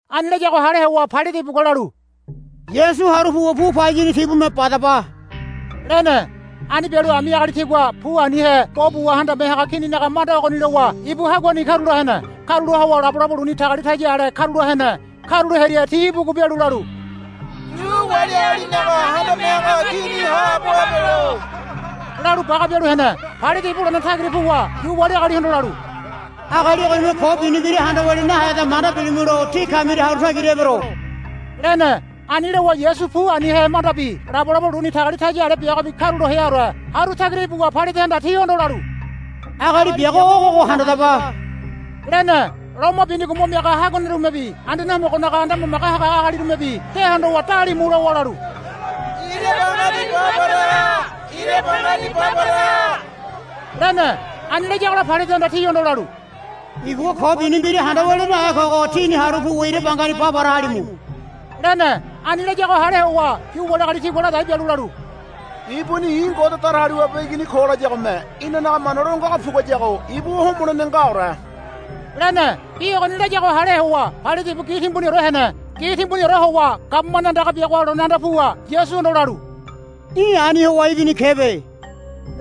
Ani layago hale howa Pailate ibugua lalu, Yasu haru puwa pu payini tibume badaba, lene. Ani bialu ami agali tigua pu anihe bo buwa handame haga kininaga manda ogoni lowa ibu haguani karula hene. Karula howa labolabo luni tagalitaya ale karula hene. Karulo hearia ti ibugu bialu lalu, Yu wali agalinaga Handame Haga Kini haabo habelo, lalu baga bialu hene. Pailate ibu lone tagira puwa Yu wali agalihondo lalu, Agali ogonime ko bini mbira handa walia naheda manda bilimulo tí kamiria haru tagira ebero, lene. Ani lowa Yasu pu anihe mandabi labolabo luni tagalitaya ale biagobi karulo heaore haru tagira ibuwa Pailatehanda tihondo lalu, Agali biago ogogo handadaba, lene. Loma binigo mo miaga haguanerumebi Anduane Homogonaga anda mamage haga agalirumebi de hondowa dalimu lowa lalu, Ira bangani ba para ha. Ira bangani ba para ha, lene. Ani layagola Pailatehanda tihondo lalu, Ibugua ko bini mbira handa walia nahe kogo tíni haru puwa ira bangani ba para halimu, lene. Ani layago hale howa Yu wali agali tigua ladai bialu lalu, Ibuni i̱ Ngode Datagaliwabe Igini ko layagome inanaga mana lo ngago puguayago ibu homolene ngaore, lene. Bi ogoni layago hale howa Pailate ibu gi timbuniore hene. Gi timbuniore howa gabumane andaga biagoha lone anda puwa Yasuhondo lalu, Í̠ ani howa ibini kebe,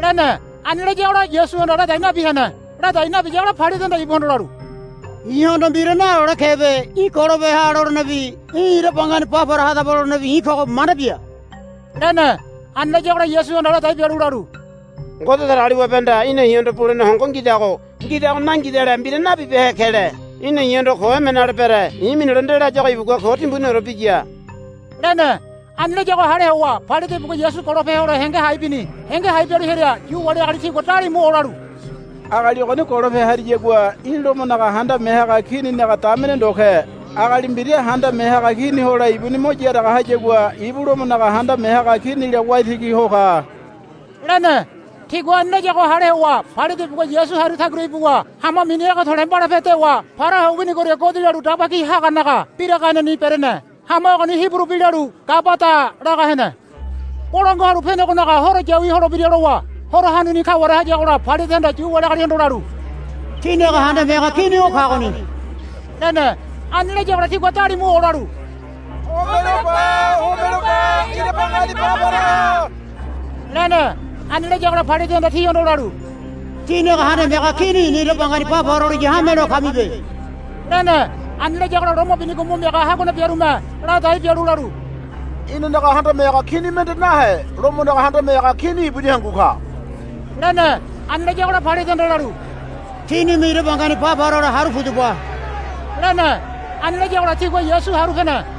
lene. Ani layagola Yasuhanda ladai nabi hene. Ladai nabiyagola Pailatehanda ibuhondo lalu, I̱hondo mbira nalole kebe. Í̠ golo peha lolenebi í̠ ira bangani ba para hadaba lolenebi i̱ kogo manda bia, lene. Ani layagola Yasuhanda ladai bialu lalu, Ngode Datagaliwabehanda í̠na i̱hondo bulene hongo ngidago nangidale mbira nabibehe kele. Í̠na i̱hondo ko emene ale bere. I̱ minilo nde layago ibugua ko timbuniore biya, lene. Ani layago hale howa Pailate ibugua Yasu golope hole henge hai bini. Henge hai bialu hearia Yu wali agali tigua dalimu olalu, Agali ogoni golope hariyagua í̠ Lomonaga handame haga Kininaga damene ndo ke. Agali mbira handame haga kini hole ibuni mo yaraga hayagua ibu Lomonaga handame haga Kinila waitigi ho ka, lene. Tigua ani layago hale howa Pailate ibugua Yasu haru tagira ibuwa hama mini Ege To̱le̱ Mbalape dewa para ho winigoria godi lalu daba ki haganaga biraganeni berene. Hama ogoni Hiburu bi lalu, Gabada, laga hene. Bolangua Halu Penegonaga Horo yawi holebira lowa horo hanuni kaware hayagola Pailatehanda Yu wali agalihondo lalu, Tínaga handame haga kini o kagoni, lene. Ani layagola tigua dalimu olalu, Homelo ba. Homelo ba. Ira bangani ba para ha, lene. Ani layagola Pailatehanda tihondo lalu, Tínaga handame haga kini i̱na ira bangani ba para holiya hamelo kamibe, lene. Ani layagola loma binigo mo miaga haguane biarume ladai bialu lalu, Inanaga handame haga kini mende nahe Lomonaga handame haga Kini ibuni hangu ka, lene. Ani layagola Pailatehanda lalu, Tínime ira bangani ba para hole haru pudaba, lene. Ani layagola tigua Yasu haru pene.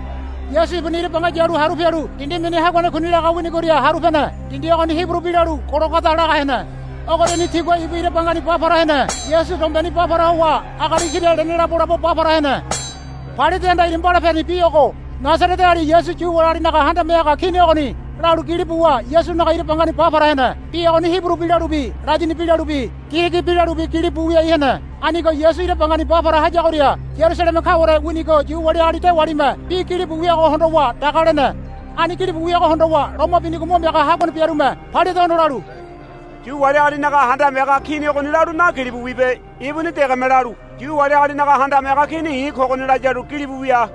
Yasu ibuni ira banga yalu haru pialu dindi mini Haguane Kuni laga winigoria haru pene. Dindi ogoni Hiburu bi lalu, Gologoda, laga hene. Ogoriani tigua ibu ira bangani ba para hene. Yasu dombeni ba para howa agali kira lene labolabo ba para hene. Pailatehanda ira mbalapeni bi ogo, Nasareteali Yasu Yu wali agalinaga Handame Haga Kini Ogoni, lalu gili buwa Yasunaga ira bangani ba para hene. Bi ogoni Hiburu bi lalubi Ladini bi lalubi Girigi bi lalubi gilibu wiai hene. Anigo Yasu ira bangani ba para hayagoria Yarusaleme kaware winigo Yu wali agali dewalime bi gilibu wiago hondowa daga lene. Ani gilibu wiago hondowa loma binigo mo miaga haguane biarume Pailatehondo lalu, Yu wali agalinaga Handame Haga Kini Ogoni lalu nagilibu wibe. Ibuni degeme lalu, Yu wali agalinaga Handame Haga Kini i̱ kogoni, laya lalu gilibu wia,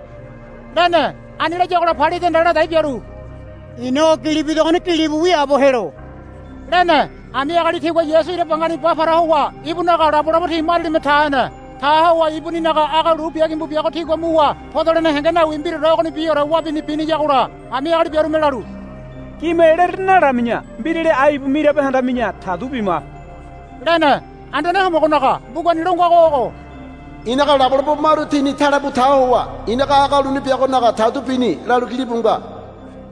lene. Ani layagola Pailatehanda ladai bialu, I̱na o gili bidogoni gilibu wiaabo helo, lene. Ami agali tigua Yasu ira bangani ba para howa ibunaga labolabo ti marialime ta hene. Ta howa ibuninaga aga lu bia gimbu biago tigua muwa podolene henge nawi mbiraore ogonibiore wabini biniyagola ami agali biarume lalu, Gime lere nalami̱ya. Mbirali ai ibu mirabe handami̱ya tadu bima, lene. Anduane Homogonaga mbugani lo ngago ogo. I̱naga labolabo maru tini tale bu ta howa i̱naga aga lu biagonaga tadu bini, lalu gilibu nga.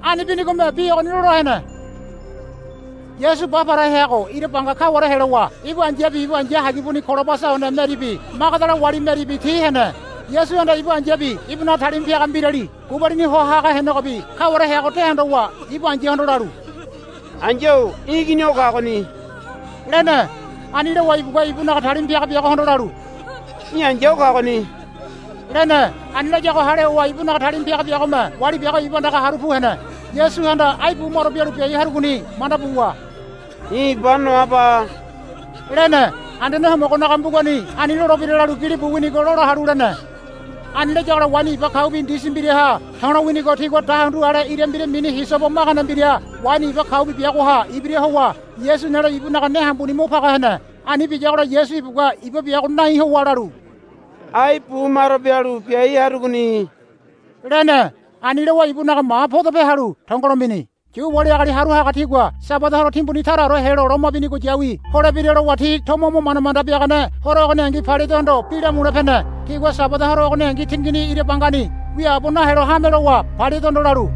Ani binigome bi ogoni lola hene. Yasu ba para heago ira banga kaware helowa ibu ai̱yabi ibu ai̱ya hagibuni Kolobasa one Meribi Magadala wali Meribi ti hene. Yasuhanda ibu ai̱yabi ibunaga talima piaga mbirali gubalini ho haga henegobi kaware heago de hondowa ibu ai̱yahondo lalu, Ai̱ya-o í̠ igini o kagoni, lene. Ani lowa ibugua ibunaga talima piaga biagohondo lalu, Í̠ ai̱ya o kagoni, lene. Ani layago hale howa ibunaga talima piaga biagome wali biago ibu andaga haru pu hene. Yasuhanda ai bumaro bialu biai harugoni manda buwa, I̱ iba noaba, lene. Anduane Homogonaga mbugani ani lolebira lalu gilibu winigo lola halu lene. Ani layagola waini iba kaubi ndisi mbiraha to̱lo winigo tigua dahundu ale ira mbira mini hisobo magane mbira waini iba kaubi biagoha ibira howa Yasu nelo ibunaga ne hambuni mo paga hene. Ani biyagola Yasu ibugua iba biago nai howa lalu, Ai bumaro bialu biai harugoni, lene. Ani lowa ibunaga ma podope halu tongolo mini. Yu wali agali haru haga tigua Sabada horo timbuni taraore helo loma bini yawi holebira lowa ti tomo mo manda manda biagane horo ogoningi Pailatehondo bi lamule pene. Tigua Sabada horo ogoningi tingini ira bangani wiaabo nahelo hame lowa Pailatehondo lalu,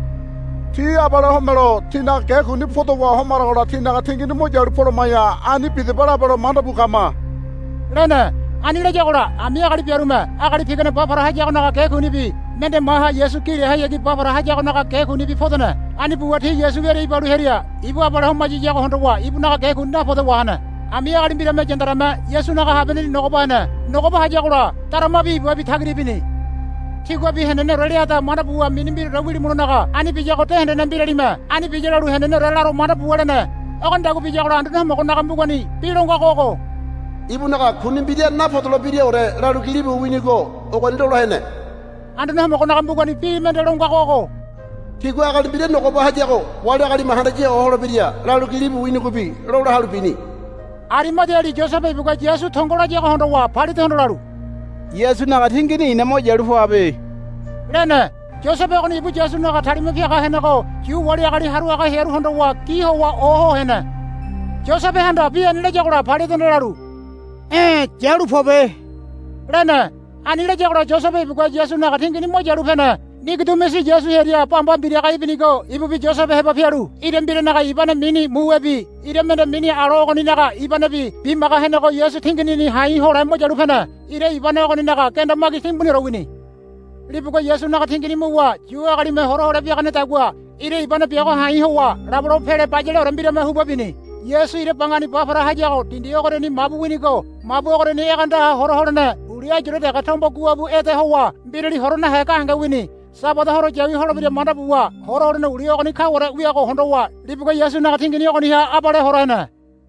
Ti abale homelo tinaga ge kuni podowa homaragola tinaga tingini mo yalu poloma̱ya ani bidaba labelo manda bu kama, lene. Ani layagola ami agali biarume agali pigane ba para hayagonaga ge kunibi mende maha Yasu gi lehayagi ba para hayagonaga ge kunibi podene. Ani buwa ti Yasu wiaria ibalu hearia ibu abale homayiyago hondowa ibunaga ge kuni napode wahene. Ami agali mbirame yandareme Yasunaga habianeni nogoba hene. Nogoba hayagola daramabi ibabi tagira ibini. Tíguabi heneneore leada manda buwa mini mbiraore wilimulonaga ani biyago de hendene mbiralime ani biya lalu heneneore laro manda buwa lene. Ogonidagua biyagola Anduane Homogonaga mbugani bi lo ngago ogo, Ibunaga kuni mbira napodolebiraore, lalu gilibu winigo ogoni lola hene. Anduane Homogonaga mbugani bi mende lo ngago ogo, Tigua agali mbira nogoba hayago wali agalime handaya ho holebira, lalu gilibu winigobi lola halu bini. Arimadiali Yosebe ibugua Yasu tongo layago hondowa Pailatehondo lalu, Yasunaga tingini i̱na mo yalu poabe, lene. Yosebe ogoni ibu Yasunaga talima piaga henego Yu wali agali haru haga hearu hondowa gi howa oho hene. Yosebehanda bi ani layagola Pailatehanda lalu, E̱ yalu pobe, lene. Ani layagola Yosebe ibugua Yasunaga tingini mo yalu pene. Nigodimusi Yasu hearia bamba mbiraga ibinigo ibubi Yosebe heba pialu ira mbiranaga ibane mini muwebi ira mende mini alo ogoninaga ibanebi bimaga henego Yasu tinginini ha̱i̱ hole mo yalu pene. Ira ibane ogoninaga genda magi timbuniore wini. Libugua Yasunaga tingini muwa Yu agalime hora hole biaganedagua ira ibane biago ha̱i̱ howa labolabo pele bayaleore mbirame huba bini. Yasu ira bangani ba para hayago dindi ogoriani mabu winigo mabu ogoriani egeandaha hora holene uli ayure dege tombo goabu ede howa mbirali hora nahe gahenge wini. Sabada horo yawi holebira manda buwa hora holene uli ogoni kaware wiago hondowa libugua Yasunaga tingini ogoniha abale hora hene.